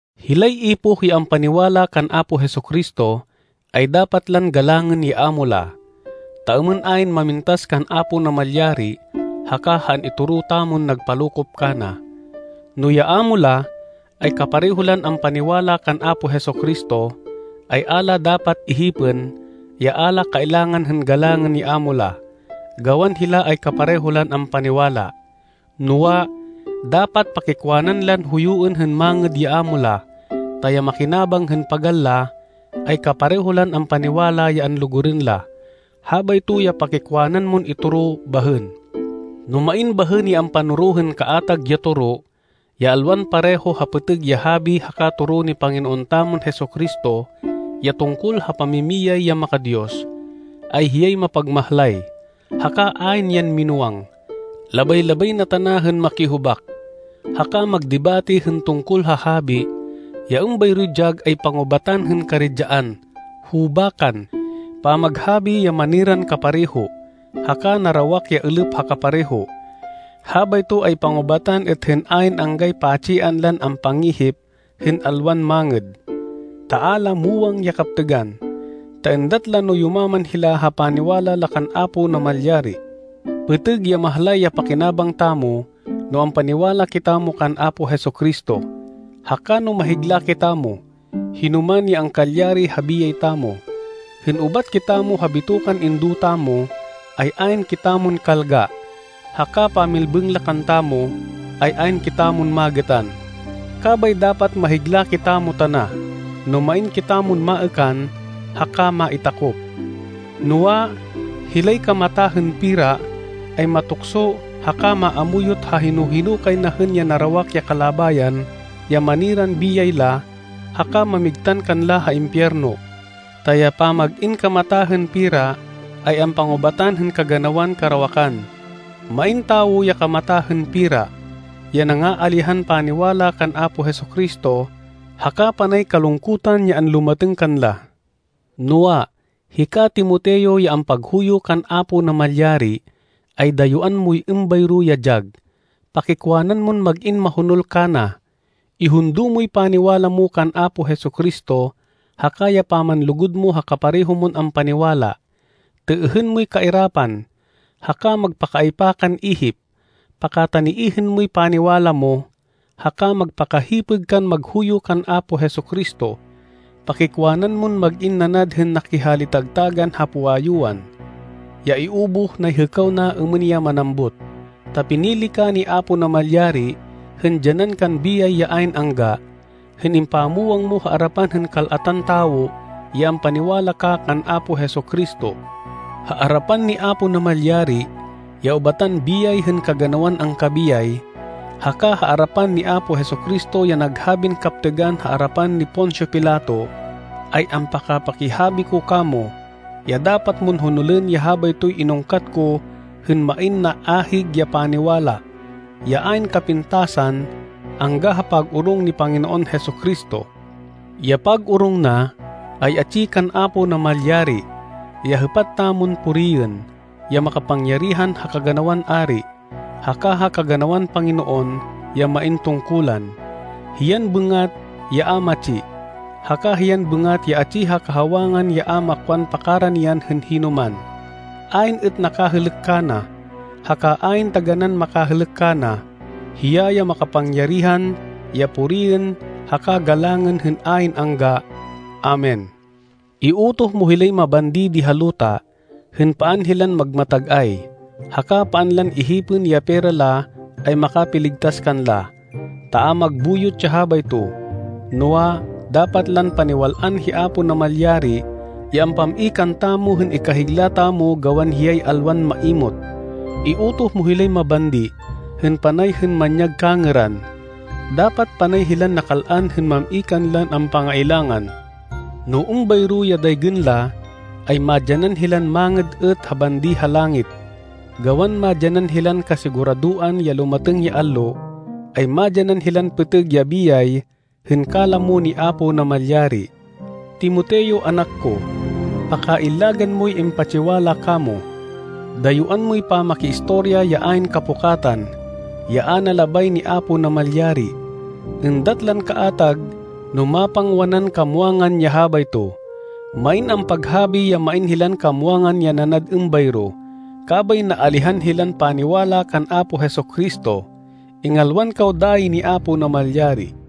Hilay ipoh ya ampaniwala kan Apo Jesu-Cristo, ay dapat lan galangên ya amo la, ta êmên ayn mamintas kan Apo Namalyari haka ha an-itoro tamon nagpalokop kana. No ya amo la, ay kapareho lan ampaniwala kan Apo Jesu-Cristo, ay a la dapat ihipên, ya a la kailangan hên galangên ya amo la, gawan hila ay kapareho lan ampaniwala. Noa, dapat pakikwanan lan huyuên hên mangêd ya amo la, ta ya makinabang hên pagal la, ay kapareho lan ampaniwala ya anlugurên la. Habayto ya pakikwanan mon itoro bahên. No main bahên ya ampanoro hên kaatag ya toro, ya alwan pareho ha pêtêg ya habi haka toro ni Panginoon tamon Jesu-Cristo ya tungkol ha pamimiyay ya maka-Diyos, ay hiyay mapagmahlay, haka ayn yan minúwang. Labay-labay na tana hên makihubak, haka magdebate hên tungkol ha habi. Ya êmbayroy dyag ay pangubatan hên karidyaan, hubakan, pamaghabi ya maniran kapareho, haka narawak ya êlêp ha kapareho. Habayto ay pangubatan êt hên ayn anggay pa-tsian lan ampangihip hên alwan mangêd, ta a la muwang ya kaptêgan, ta êndat la no yumaman hila ha paniwala la kan Apo Namalyari. Pêtêg ya mahlay ya pakinabang tamo no ampaniwala kitamo kan Apo Jesu-Cristo, haka no mahigla kitamo, hinoman ya angkalyari ha biyay tamo. Hên ubat kitamo ha bitokan indo tamo, ay ayn kitamon kalga, haka pamilbêng la kantamo, ay ayn kitamon magêtan. Kabay dapat mahigla kitamo tana, no main kitamon maêkan haka maitakop. Noa, hilay kamata hên pera, ay matukso haka maamuyot ha hino-hino kay na hên ya narawak ya kalabayan ya maniran biyay la haka mamigtan kanla ha impiyerno. Ta ya pamag-in kamata hên pera, ay ampangubatan hên kaganawan karawakan. Main tawo ya kamata hên pera, ya nangaalihan paniwala kan Apo Jesu-Cristo haka panay kalungkutan ya anlumatêng kanla. Noa, hika, Timoteo, ya ampaghuyo kan Apo Namalyari, ay dayuán moy êmbayro ya dyag. Pakikwanan mon mag-in mahonol kana. Ihundo moy paniwala mo kan Apo Jesu-Cristo, haka ya pamanlugud mo ha kapareho mon ampaniwala. Têêhên moy kairapan, haka magpakaaypa kan ihip. Pakataniêhên moy paniwala mo, haka magpakahipêg kan maghuyo kan Apo Jesu-Cristo. Pakikwanan mon mag-in nanad hên nakihali-tagtagan ha puwayuan, ya iubuh nay hêkaw na êmên ya manambut. Ta pinili ka ni Apo Namalyari hên dyanan kan biyay ya ayn angga, hên impamwang mo ha arapan hên kal-atan tawo, ya ampaniwala ka kan Apo Jesu-Cristo. Ha arapan ni Apo Namalyari, ya ubatan biyay hên kaganawan angkabiyay, haka ha arapan ni Apo Jesu-Cristo ya naghabin kaptêgan ha arapan ni Poncio Pilato, ay ampaka-pakihabi ko kamo, ya dapat mon honolên ya habaytoy inungkat ko hên main naahig ya paniwala, ya ayn kapintasan angga ha pag-orong ni Panginoon Jesu-Cristo. Ya pag-orong na, ay atsi kan Apo Namalyari, ya hêpat tamon puriên, ya makapangyarihan ha kaganawan ari, haka ha kaganawan panginoon ya main tungkulan. Hiyan bêngat ya a matsi, haka hiyan bêngat ya atsi ha kahawangan ya a makwan pakaranian hên hinoman. Ayn êt nakahêlêk kana, haka ayn taganán makahêlêk kana. Hiya ya makapangyarihan ya puriên haka galangên hên ayn angga. Amen. Iutoh mo hilay mabandi di ha luta, hên paan hilan magmatag-ay, haka paan lan ihipên ya pera la ay makapiligtas kanla, ta a magbuyot ya habayto. Noa, dapat lan paniwal-an hi Apo Namalyari ya ampam-i kantamo hên ikahigla tamo gawan hiyay alwan maimot. Iutoh mo hilay mabandi hên panay hên manyag kangêran. Dapat panay hilan nakal-an hên mam-i kanlan ampangailangan. No êmbayro ya daygên la, ay madyanan hilan mangêd êt ha bandi ha langit, gawan madyanan hilan kasiguradoan ya lumatêng ya allo, ay madyanan hilan pêtêg ya biyay hên kalamo ni Apo Namalyari. Timoteo, anak ko, pakaillagan moy impatsiwala kamo. Dayuán moy pamakiistorya ya ayn kapukatan, ya a na labay ni Apo Namalyari. Êndat lan kaatag no mapangwanan kamwangan ya habayto. Main ampaghabi ya main hilan kamwangan ya nanad êmbayro, kabay naalihan hilan paniwala kan Apo Jesu-Cristo. Ingalwan kaw dayi ni Apo Namalyari.